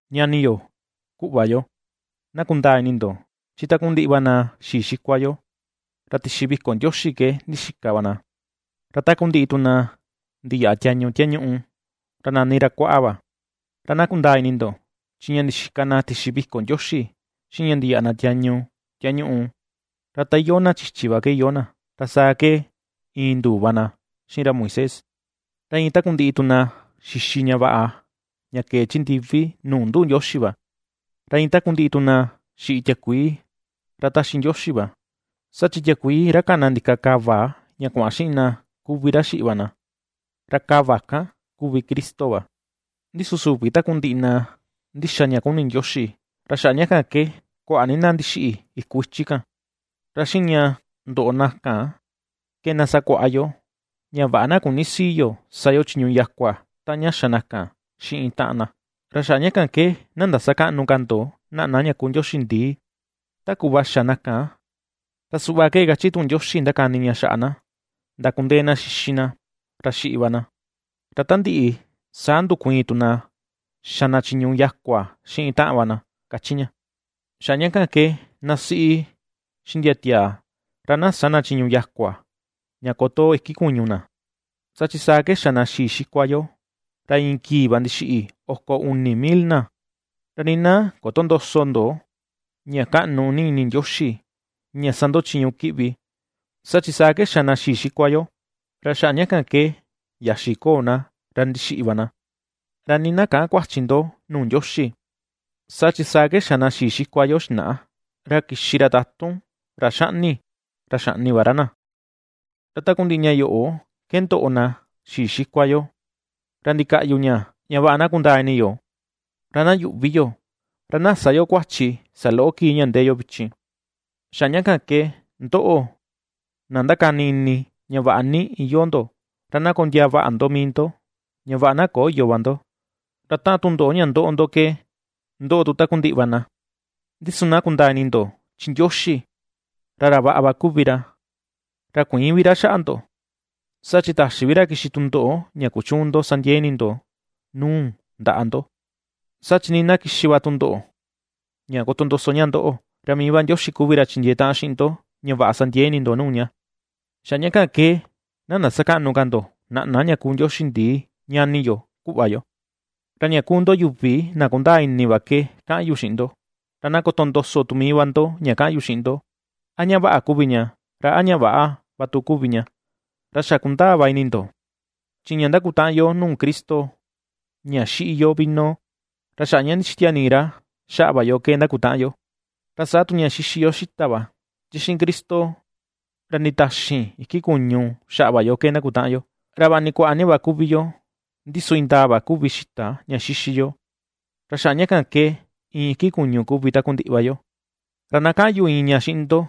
Ñani yo, kuꞌva yo, na kundaa ini ndo, chi takundiꞌi va na xii xikua yo, ra tixi viko Ndioxi ke ndixika va na, ra takundiꞌi tu na ndiyaꞌa tiañu tiañuꞌu, ra nani ra Kuaꞌa va. Ra na kundaa ini ndo, chi ña ndixika na tixi viko Ndioxi, xiꞌin ña ndiyaꞌa na tiañu tiañuꞌu, ra ta iyoo na chichi va ke iyoo na, ra saa ke iin nduu va na xiꞌin ra Moisés. Ra iin takundiꞌi tu na xixi ña vaꞌa ña kee chi ndivi nuu nduꞌu Ndioxi va. Ra iin takundiꞌi tu na xiꞌi tiakuii ra taxi Ndioxi va. Saa chi tiakuii ra kana ndika kava ña kuaꞌan xiꞌin na, kuvi ra xiꞌi va na, ra kava kan kuvi Cristo va. Ndi su, süvi takundiꞌi na ndíxa ña kuni Ndioxi, ra xaꞌa ña kan ke kuaꞌa ni na ndixiꞌi iku ichi kan. Ra xiꞌin ña ndoꞌo na kan ke na sakuaꞌa yo, ña vaꞌa na küni sii yo sa yo chiñu yakua taꞌan ña xa na kan xiꞌin taꞌan na. Ra xaꞌa ña kan ke na ndasakäꞌnu ka ndo naꞌna ña kuu ndioxi ndii, ta kuꞌva xa na kan, ra suꞌva ke kachi tuꞌun Ndioxi ndakani ña xaꞌa na: “Ndakundee na xixi na, ra xiꞌi va na, ra ta ndiꞌi saa ndukuiin tu na xa na chiñu yakua xiꞌin taꞌan va na”, kachi ña. Xaꞌa ña kan ke na siꞌi, xiꞌin ndia tiaa ra na sä na chiñu yakua, ña kotoo iki kuñu na, saa chi saa ke xa na xii xikua yo, ra iin kii va ndixiꞌi oko uni mil na. Ra nii na kötondoso ndo, ña kaꞌnu ni ini Ndioxi ña sa ndo chiñu kiꞌvi, saa chi saa ke xa na xii xikua yo, ra xaꞌa ña kan ke yaxi koo na, ra ndixiꞌi va na. Ra nii na käꞌan kuachi ndo nuu Ndioxi, saa chi saa ke xa na xii xikua yo xinaꞌa, ra kixi ra tatun ra xaꞌni, ra xaꞌni va ra na. Ra takundiꞌi ña yoꞌo ke ndoꞌo na xii xikua yo, ra ndikaꞌyu ña, ña vaꞌa na kundaa ini yo, ra na yuꞌvi yo, ra na sä yo kuachi saloꞌo kii ña ndee yo vichin. Xaꞌa ña kan ke, ndoꞌo, na ndákáni ini ña vaꞌa ni iyoo ndo, ra na kondiaa vaꞌa ndo mii ndo, ña vaꞌa na köyo va ndo. Ra taꞌan tundoꞌo ña ^ndoꞌo ndo ke ^ndoꞌo tu takundiꞌi va na. Ndi su na kundaa ini ndo chi Ndioxi, ra ra vaꞌa va kuvi ra, ra kuïin vi ra xaꞌa ndo, saa chi ^täxi vi ra kixi tundoꞌo ña kuchüun ndo sa ndiee ini ndo nuu ndaꞌa ndo. Saa chi nii na kixi va tundoꞌo ña kotondoso ña ndoꞌo, ra mii va Ndioxi kuvi ra chindiee taꞌan xiꞌin ndo, ña vaꞌa sa ndiee ini ndo nuu ña. Xaꞌa ña kan ke na ndasakäꞌnu ka ndo naꞌna ña kuu ndioxi ndii, ñani yo, kuꞌva yo. Ra ña kuu ndo yuvi na kundaa ini va ke kaꞌan yu xiꞌin ndo, ra na kotondoso tu mii va ndo ña kaꞌan yu xiꞌin ndo, a ña vaꞌa kuvi ña, ra a ña väꞌa va tu kuvi ña. Ra xa kundaa va ini ndo, chi ña ^ndakutaꞌan yo nuu Cristo ña xiꞌi yo vino, ra xaꞌa ña ndixitia nii ra xaꞌa va yo ke ndakutaꞌan yo; ra saa tu ña xixi yo xita va, chi xiꞌin Cristo ra nditaxin iki kuñu xaꞌa va yo ke ndakutaꞌan yo. Ra va ni kuaꞌa ni va kuvi yó, ndi su indaa va kuvi xita ña xixi yo, ra xaꞌa ña kan ke, iin iki kuñu kuvi takundiꞌi va yo. Ra na kaꞌan yu iin ña xiꞌin ndo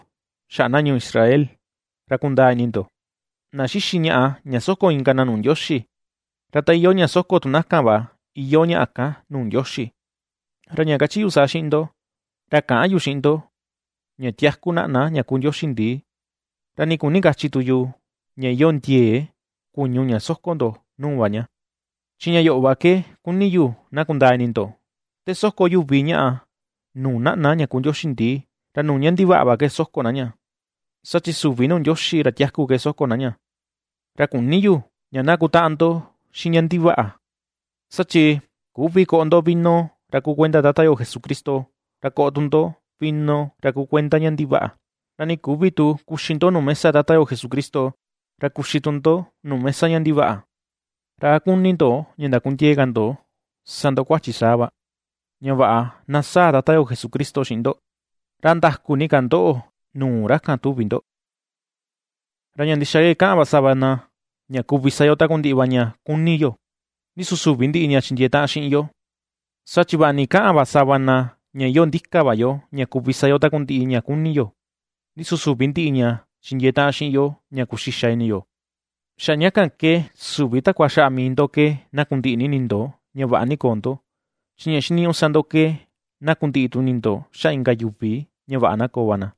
xaꞌa na ñuu Israel, ra kundaa ini ndo; na xixi ñaꞌa ña soko inka na nuu Ndioxi, ra ta iyoo ña soko tu na kan va iyoo ñaꞌa kan nuu Ndioxi. Ra ña kachi yu saa xiꞌin ndo, ra käꞌan yu xiꞌin ndo, ña tiaku naꞌna ña kuu ndioxi ndii, ra nii küni kachi tu yu, ña iyoo ndiee kuñu ña soko ndo nuu va ña. Chi ña yoꞌo va ke kuni yu na kundaa ini ndo, te soko yuvi ñaꞌa nuu naꞌna ña kuu ndioxi ndii, ra nuu ña ndivaꞌa va ke soko na ña, saa chi süvi nuu Ndioxi ra tiaku ke soko na ña; ra küni yu, ña na kutaꞌan ndo xiꞌin ña ndivaꞌa. Saa chi küvi koꞌo ndo vino ra kuu kuenda Tata yo Jesucristo, ra koꞌo tu ndo, vino ra kuu kuenda ña ndivaꞌa; ra nii küvi tu kuxi ndo nuu mesa Tata yo Jesucristo, ra kuxi tu ndo nuu mesa ña ndivaꞌa. ¿Ra a kuni ndo ña ndakundiee ka ndo sa ndo kuachi saa va, ña vaꞌa na sáa̱̱ Tata yo Jesucristo xiꞌin ndo? ¿A ndaku ni ka ndoꞌo nuu ra kan tuvi ndo? Ra ña ndixa va ke kaꞌan sava na, ña kuvi sa yo takundiꞌi va ña kuni yo; ndi su süvi ndiꞌi ña chindiee taꞌan xiꞌin yo. Saa chi vaꞌa ni kaꞌan va sava na ña iyoo ndika va yo ña kuvi sa yo takundiꞌi ña kuni yo, ndi su süvi ndiꞌi ña chindiee taꞌan xiꞌin yo ña kuxixa ini yo. Xaꞌa ña kan ke süvi takua xaꞌa mii ndo ke na kundiꞌi ini ndo ña vaꞌa ni koo ndo, chi ña xiniñuꞌu sa ndo ke na kundiꞌi tu ini ndo xaꞌa inka yuvi ña vaꞌa na koo va na.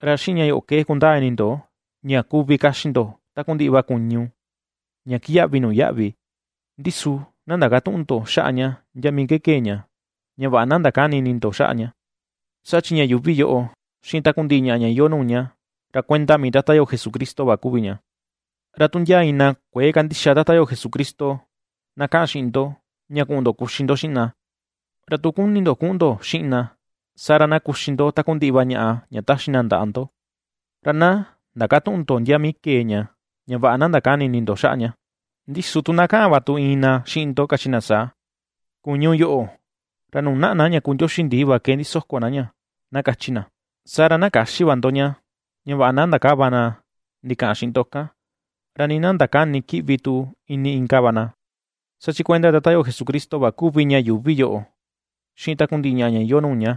Ra xiꞌin ña yoꞌo ke kundaa ini ndo ña kuvi kaxi ndo takundiꞌi va kuñu ña kiyaꞌvi nuu yaꞌvi, ndi su na ndakatüꞌun ndo xaꞌa ña ndia mii kee ña, ña vaꞌa na ndakäni ini ndo xaꞌa ña; saa chi ña yuuvi yoꞌo xiꞌin takundiꞌi ñaꞌa ña iyoo nuu ña, ra kuenda mii Tata yo Jesucristo va kuvi ña. Ra tu ndia iin na kuëe kandixa Tata yo Jesucristo na kaꞌan xiꞌin ndo ña kuꞌun ndo kuxi ndo xiꞌin na, ra tu kuni ndo kuꞌun ndo xiꞌin na, saa ra na kuxi ndo takundiꞌi va ñaꞌa ña taxi na ndaꞌa ndo, ra na ndakatüꞌun ndo ndia mii kee ña, ña vaꞌa na ndakäni ini ndo xaꞌa ña. Ndi su tu na kaꞌan va tu iin na xiꞌin ndo, kachi na saa: “Kuñu yoꞌo, ra nuu naꞌna na ña kuu ndioxi ndii va ke ndisoko na ña”, na kachi na. Saa ra na käxi va ndo ña, ña vaꞌa na ndakäva na ndikaꞌan xiꞌin ndo kan, ra nii na ndakäni kiꞌvi tu ini inka va na, saa chi kuenda Tata yo Jesucristo va kuvi ña yuuvi yoꞌo, xiꞌin takundiꞌi ñaꞌa ña iyoo nuu ña.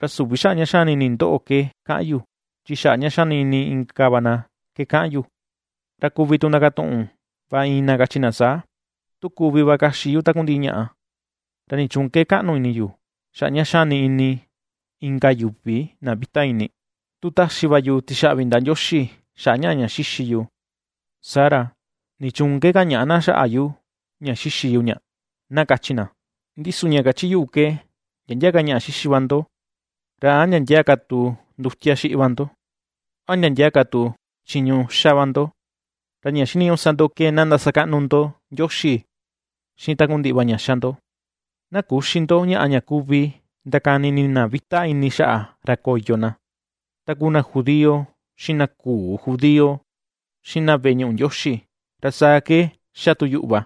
Ra süvi xaꞌa ña xani ini ndoꞌo ke kaꞌan yu, chi xaꞌa ña xani ini inka va na ke kaꞌan yu. Ra kuvi tu ndakatuꞌun va iin na kachi na saa: “¿Tu kuvi va kaxi yu takundiꞌi ñaꞌa, ra nichuun ke kaꞌnu ini yu, xaꞌa ña xani ini inka yuvi na vita ini? Tu taxi va yu tixaꞌvi ndaꞌa Ndioxi xaꞌa ñaꞌa ña xíxi yu, saa ra, ¿nichuun ke kañaꞌa na xaꞌa yu ña xixi yu ña?”, na kachi na. Ndi su ña kachi yuꞌu ke, ndia ndia ka ñaꞌa xixi va ndo, ra a ndia ndia ka tu ndutia xiꞌi va ndo, a ndia ndia ka tu chiñu xa va ndo, ra ña xiniñuꞌu sa ndo ke na ndasakaꞌnu ndo Ndioxi xiꞌin takundiꞌi va ña xa ndo. Na küxi ndo ñaꞌa ña kuvi ndakani ini na vita ini xaꞌa ra koyo na, ta kuu na judío, xiꞌin na küu judío, xiꞌin na veꞌe ñuꞌu Ndioxi. Ra saa ke ^xa tu yuꞌu va,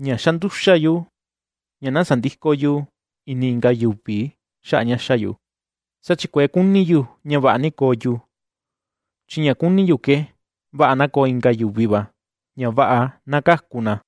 ña ^xa nduxa yu ña na sandïko yu ini inka yuvi xaꞌa ña ^xa yu; saa chi kuëe kuni yu ña vaꞌa ni na koo yu, chi ña kuni yu ke vaꞌa na koo inka yuvi va, ña vaꞌa na kaku na.